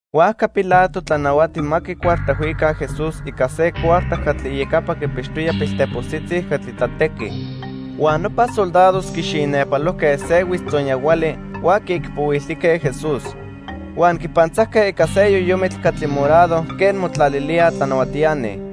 Huajca Pilato tlanahuati ma quicuartajhuica Jesús ica se cuarta catli iyecapa quipixtoya piltepostzitzi catli tlatequij. Huan nopa soldados quixinepalojque se huitztzonyahuali huan quiicpohuiltijque Jesús. Huan quipantzajque ica se yoyomitl catli morado quen motlalilíaj tlanahuatiani.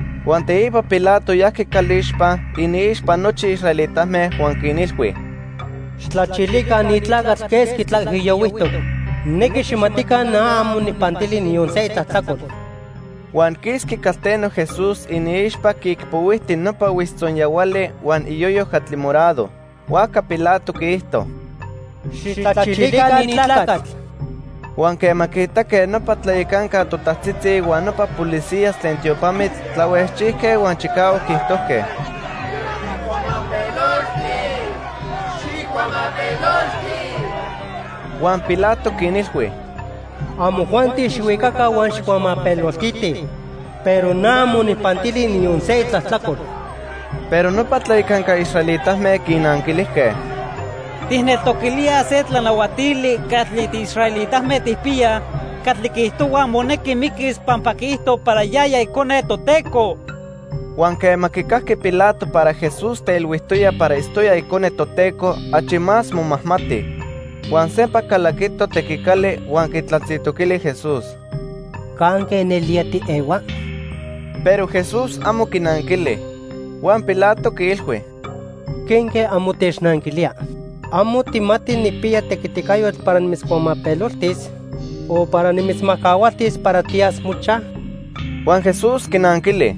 Huan teipa Pilato yajqui calixpa iniixpa nochi israelitame huan quinilhui: —Xijtlachilica ni tlacatl quesqui tlaijiyohuijtoc. Nijnequi xijmatica na amo nijpantili niyon se itlajtlacol. Huan quisqui calteno Jesús iniixpa quiicpohuijti nopa huitztzonyahuali huan iyoyo catli morado. Huajca Pilato quiijto: —Xijtlachilica ni tlacatl. Huan quema quiitaque nopa tlayacanca totajtzitzi huan nopa policías tlen tiopamitl, tlahuejchijque huan chicahuac quiijtojque: —¡Xijcuamapelolti! ¡Xijcuamapelolti! Huan Pilato quinilhui: —Amojuanti xijhuicaca huan xijcuamapeloltitij, pero na amo nijpantili niyon se itlajtlacol. Pero nopa tlayacanca israelitame quinanquilijque: —Tijneltoquilíaj se tlanahuatili catli tiisraelitame tijpiyaj catli quiijtohua monequi miquis pampa quiijto para yaya Icone Toteco. Huan quema quicajqui Pilato para Jesús teilhuijtoya para itztoya Icone Toteco, achi más momajmati. Huan sempa calaquito tequicali huan quitlatzintoquili Jesús: —¿Canque nelía tiehua? Pero Jesús amo quinanquili. Huan Pilato quiilhui: —¿Quenque amo technanquilía? ¿Amo tijmati nijpiya tequiticayotl para nimitzcuamapeloltis o para nimitzmajcahualtis para tiyas mochaj? Huan Jesús quinanquili: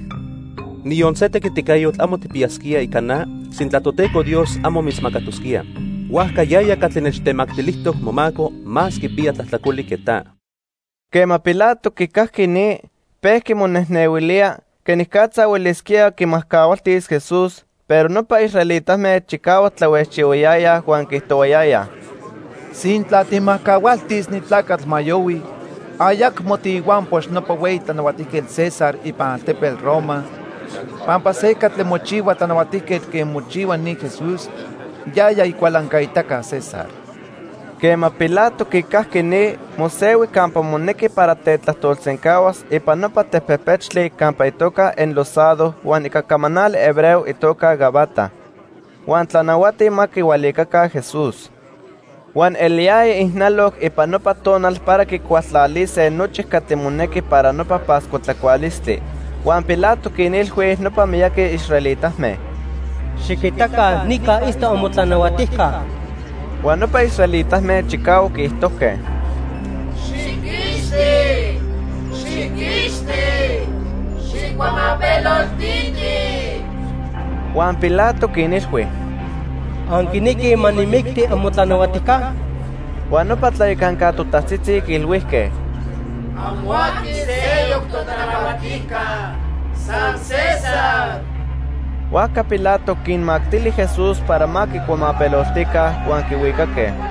—Niyon se tequiticayotl amo tijpiyasquía ica na sintla Toteco Dios amo mitzmacatosquía. Huajca yaya catli nechtemactilijtoc momaco más quipiya tlajtlacoli que ta. Quema Pilato quicajqui ni, pejqui monejnehuilía quenicatza huelisquía quimajcahualtis Jesús, pero nopa israelitame chicahuac tlahuejchihuayayaj huan quiijtohuayayaj: —Sintla tijmajcahualtis ni tlacatl ma yohui, ayacmo tiihuampox nopa hueyi tlanahuatijquetl César ipan altepetl Roma, pampa se catli mochihua tlanahuatijquetl quen mochihua ni Jesús, yaya icualancaitaca César. Quema Pilato quicajqui ni, mosehui campa monequi para tetlajtolsencahuas ipan nopa tepejpechtli campa itoca Enlosado huan ica camanali hebreo itoca Gabata. Huan tlanahuati ma quihualicaca Jesús. Huan eliyaya ijnaloc ipan nopa tonal para quicualtlalise nochi catli monequi para nopa Pascua tlacualistli. Huan Pilato quinilhui nopa miyaqui israelitame: —Xiquitaca nica itztoc amotlanahuatijca. Huan nopa israelitame chicahuac quiijtojque: —¡Xijquixti, xijquixti, xijcuamapeloltiti! Huan Pilato quinilhui: —¿Anquinequij ma nijmicti amotlanahuatijca? Huan nopa tlayacanca totajtzitzi quiilhuijque: —Amo aqui seyoc totlanahuatijca, san César. Huajca Pilato quinmactili Jesús para ma quicuamapeloltica, huan quihuicaque.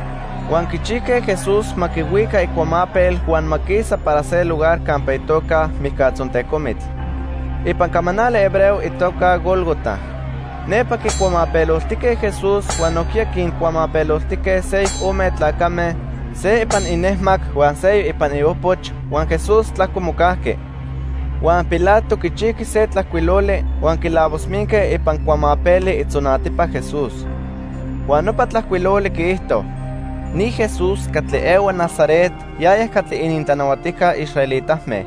Huan quichijque Jesús ma quihuica icuamapel huan ma quisa para se lugar campa itoca "Mijcatzontecomitl" (ipan camanali hebreo itoca Gólgota). Nepa quicuamapeloltijque Jesús huan nojquiya quincuamapeloltijque seyoc ome tlacame, se ipan inejmac huan seyoc ipan iopoch huan Jesús tlajco mocajqui. Huan Pilato quichijqui se tlajcuiloli huan quilavosminque ipan cuamapeli itzonatipa Jesús. Huan nopa tlajcuiloli quiijto:|sc NI JES'US CATLI EHUA NAZARET, YAYA CATLI ININTLANAHUATIJCA ISRAELITAME|r.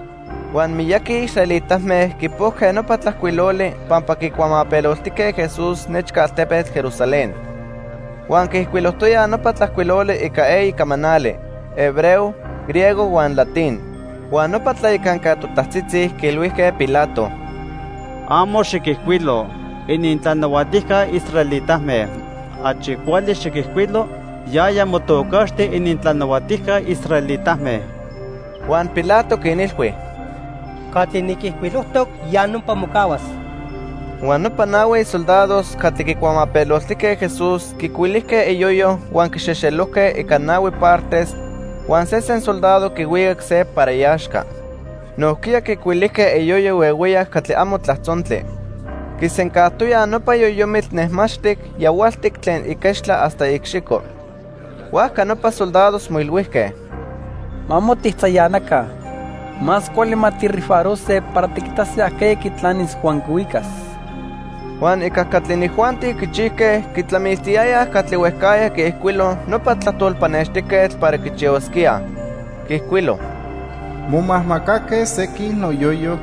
Huan miyaqui israelitame quipojque nopa tlajcuiloli pampa quicuamapeloltijque Jesús nechca altepetl Jerusalén. Huan quiijcuilojtoyaj nopa tlajcuiloli ica eyi camanali; hebreo, griego huan latín. Huan nopa tlayacanca totajtzitzi quiilhuijque Pilato: —Amo xiquijcuilo: 'Inintlanahuatijca israelitame.' Achi cuali xiquijcuilo: 'Yaya motocaxti inintlanahuatijca israelitame.' Huan Pilato quinilhui: —Catli niquijcuilojtoc, ya nopa mocahuas. Huan nopa nahui soldados catli quicuamapeloltijque Jesús quicuilijque iyoyo huan quixejxelojque ica nahui partes huan sesen soldado quihuicac se para iaxca. Nojquiya quicuilijque iyoyo huehueyac catli amo tlajtzontli. Quisencajtoyaj nopa yoyomitl nejmaxtic yahualtic tlen iquechtla hasta iicxico. Huajca nopa soldados moilhuijque: —Ma amo tijtzayanaca. Más cuali ma tijrifarose para tiquitase ajqueya quitlanis huan quihuicas. Huan ica catli inijuanti quichijque quitlamiltiyayaj catli huejcajya quiijcuilo nopa tlajtol pannextijquetl para quichihuasquíaj. Quiijcuilo: "Momajmacaque sequin noyoyo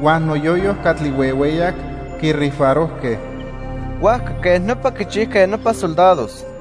huan noyoyo catli huehueyac, quirifarojque." Huajca quej nopa quichijque nopa soldados.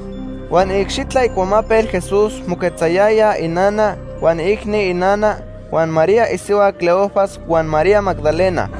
Huan iicxitla icuamapel Jesús moquetzayayaj inana, huan iicni inana, huan María isihua Cleofas huan María Magdalena.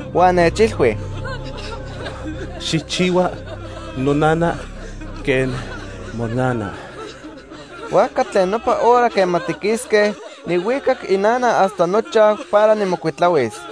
Huan nechilhui: —Xijchihua nonana quen monana. Huajca tlen nopa hora quema tiquisque, nijhuicac inana hasta nochaj para nijmocuitlahuis.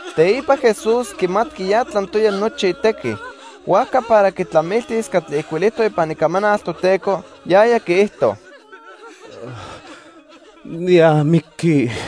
Teipa Jesús quimatqui ya tlantoya nochi itequi. Huajca para quitlamiltis catli ijcuilijtoc ipan Icamanal Toteco, yaya quiijto: —Niamiqui.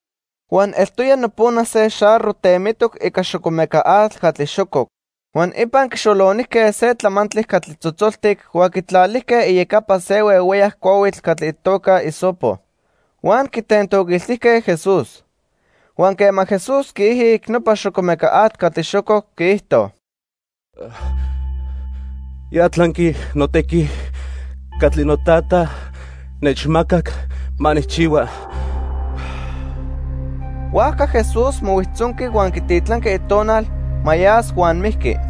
Huan eltoya nopona se xarro temitoc ica xocomeca atl catli xococ. Huan ipan quixolonijque se tlamantli catli tzotzoltic huan quitlalijque iyecapa se huehueyac cuahuitl catli itoca hisopo. Huan quitentoquiltijque Jesús. Huan quema Jesús quiijic nopa xocomeca atl catli xococ, quiijto: —Ya tlanqui notequi catli noTata nechmacac ma nijchihua. Huajca Jesús mohuijtzonqui huan quititlanqui itonal ma yas huan mijqui.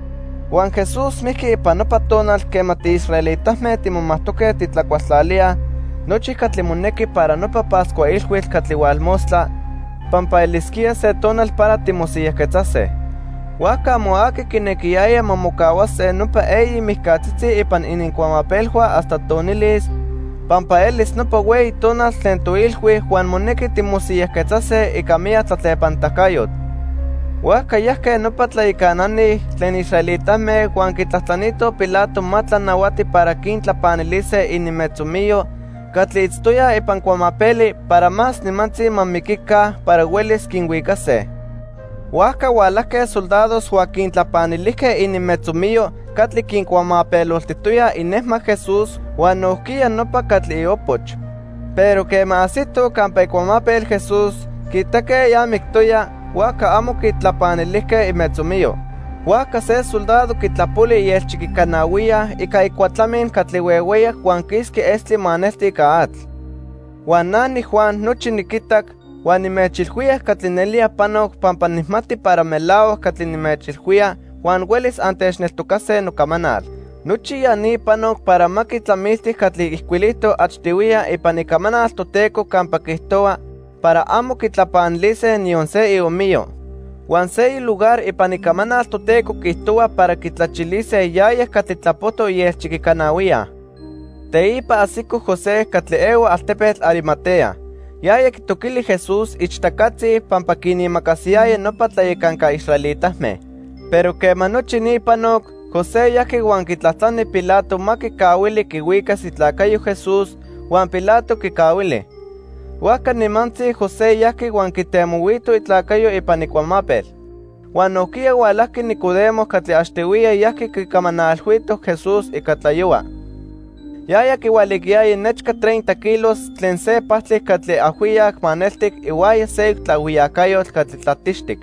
Huan Jesús mijqui ipan nopa tonal quema tiisraelitame timomajtoque titlacualtlalíaj nochi catli monequi para nopa Pascua Ilhuitl catli hualmostla pampa elisquía se tonal para timosiyajquetzase. Huajca amo aqui quinequiyaya ma mocahuase nopa eyi mijcatzitzi ipan inincuamapelhua hasta tonilis, pampa elis nopa hueyi tonal tlen toilhui huan monequi timosiyajquetzase ica miyac tlatlepanitacayotl. Huajca yajque nopa tlayacanani tlen israelitame huan quitlajtlanitoj Pilato ma tlanahuati para quintlapanilise ininmetzomiyo catli itztoyaj ipan cuamapeli para más nimantzi ma miquica para huelis quinhuicase. Huajca hualajque soldados huan quintlapanilijque ininmetzomiyo catli quincuamapeloltijtoyaj inejmac Jesús huan nojquiya nopa catli iopoch. Pero quema ajsitoj campa icuamapel Jesús, quiitaque ya mictoya, huajca amo quitlapanilijque imetzomiyo. Huajca se soldado quitlapoli ielchiquicanahuiya ica icuatlamin catli huehueyac huan quisqui estli maneltic ica atl. Huan na niJuan nochi niquitac, huan nimechilhuía catli nelía panoc pampa nijmati para melahuac catli nimechilhuía huan huelis antechneltocase nocamanal. Nochi ya ni panoc para ma quitlamilti catli ijcuilijtoc achtihuiya ipan Icamanal Toteco campa quiijtohua para amo quitlapanilise niyon se iomiyo. Huan seyoc lugar ipan Icamanal Toteco quiijtohua para quitlachilise yaya catli tlapojtoc ielchiquicanahuiya. Teipa ajsico José catli ehua altepetl Arimatea. Yaya quitoquili Jesús ichtacatzi pampa quinimacasiyaya nopa tlayacanca israelitame. Pero quema nochi ni panoc, José yajqui huan quitlajtlani Pilato ma quicahuili quihuicas itlacayo Jesús, huan Pilato quicahuili. Huajca nimantzi José yajqui huan quitemohuito itlacayo ipan icuamapel. Huan nojquiya hualajqui Nicodemo catli achtihuiya yajqui quicamanalhuito Jesús ica tlayohua. Yaya quihualicayaya nechca treinta kilos tlen se pajtli catli ajhuiyac maneltic ihuaya seyoc tlaajhuiyacayotl catli tlatixtic.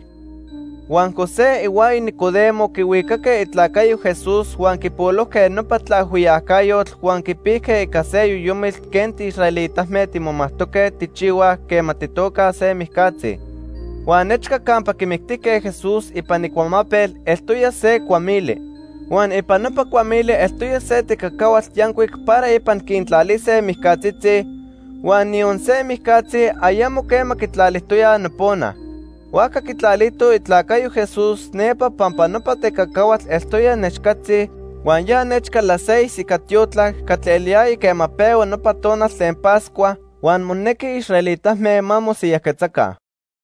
Huan José ihuaya Nicodemo quihuicaque itlacayo Jesús huan quipolojque nopa tlaajhuiyacayotl huan quipijque ica se yoyomitl quen tiisraelitame timomatque tijchihuaj quema tijtocaj se mijcatzi. Huan nechca campa quimictijque Jesús ipan icuamapel eltoya se cuamili. Huan ipan nopa cuamili eltoya se tecacahuatl yancuic para ipan quintlalise mijcatzitzi, huan niyon se mijcatzi ayamo quema quitlalijtoyaj nopona. Huajca quitlalitoj itlacayo Jesús nepa pampa nopa tecacahuatl eltoya nechcatzi, huan ya nechca las seis ica tiotlac catli eliyaya quema pehua nopa tonal tlen Pascua huan monequi israelitame ma mosiyajquetzaca.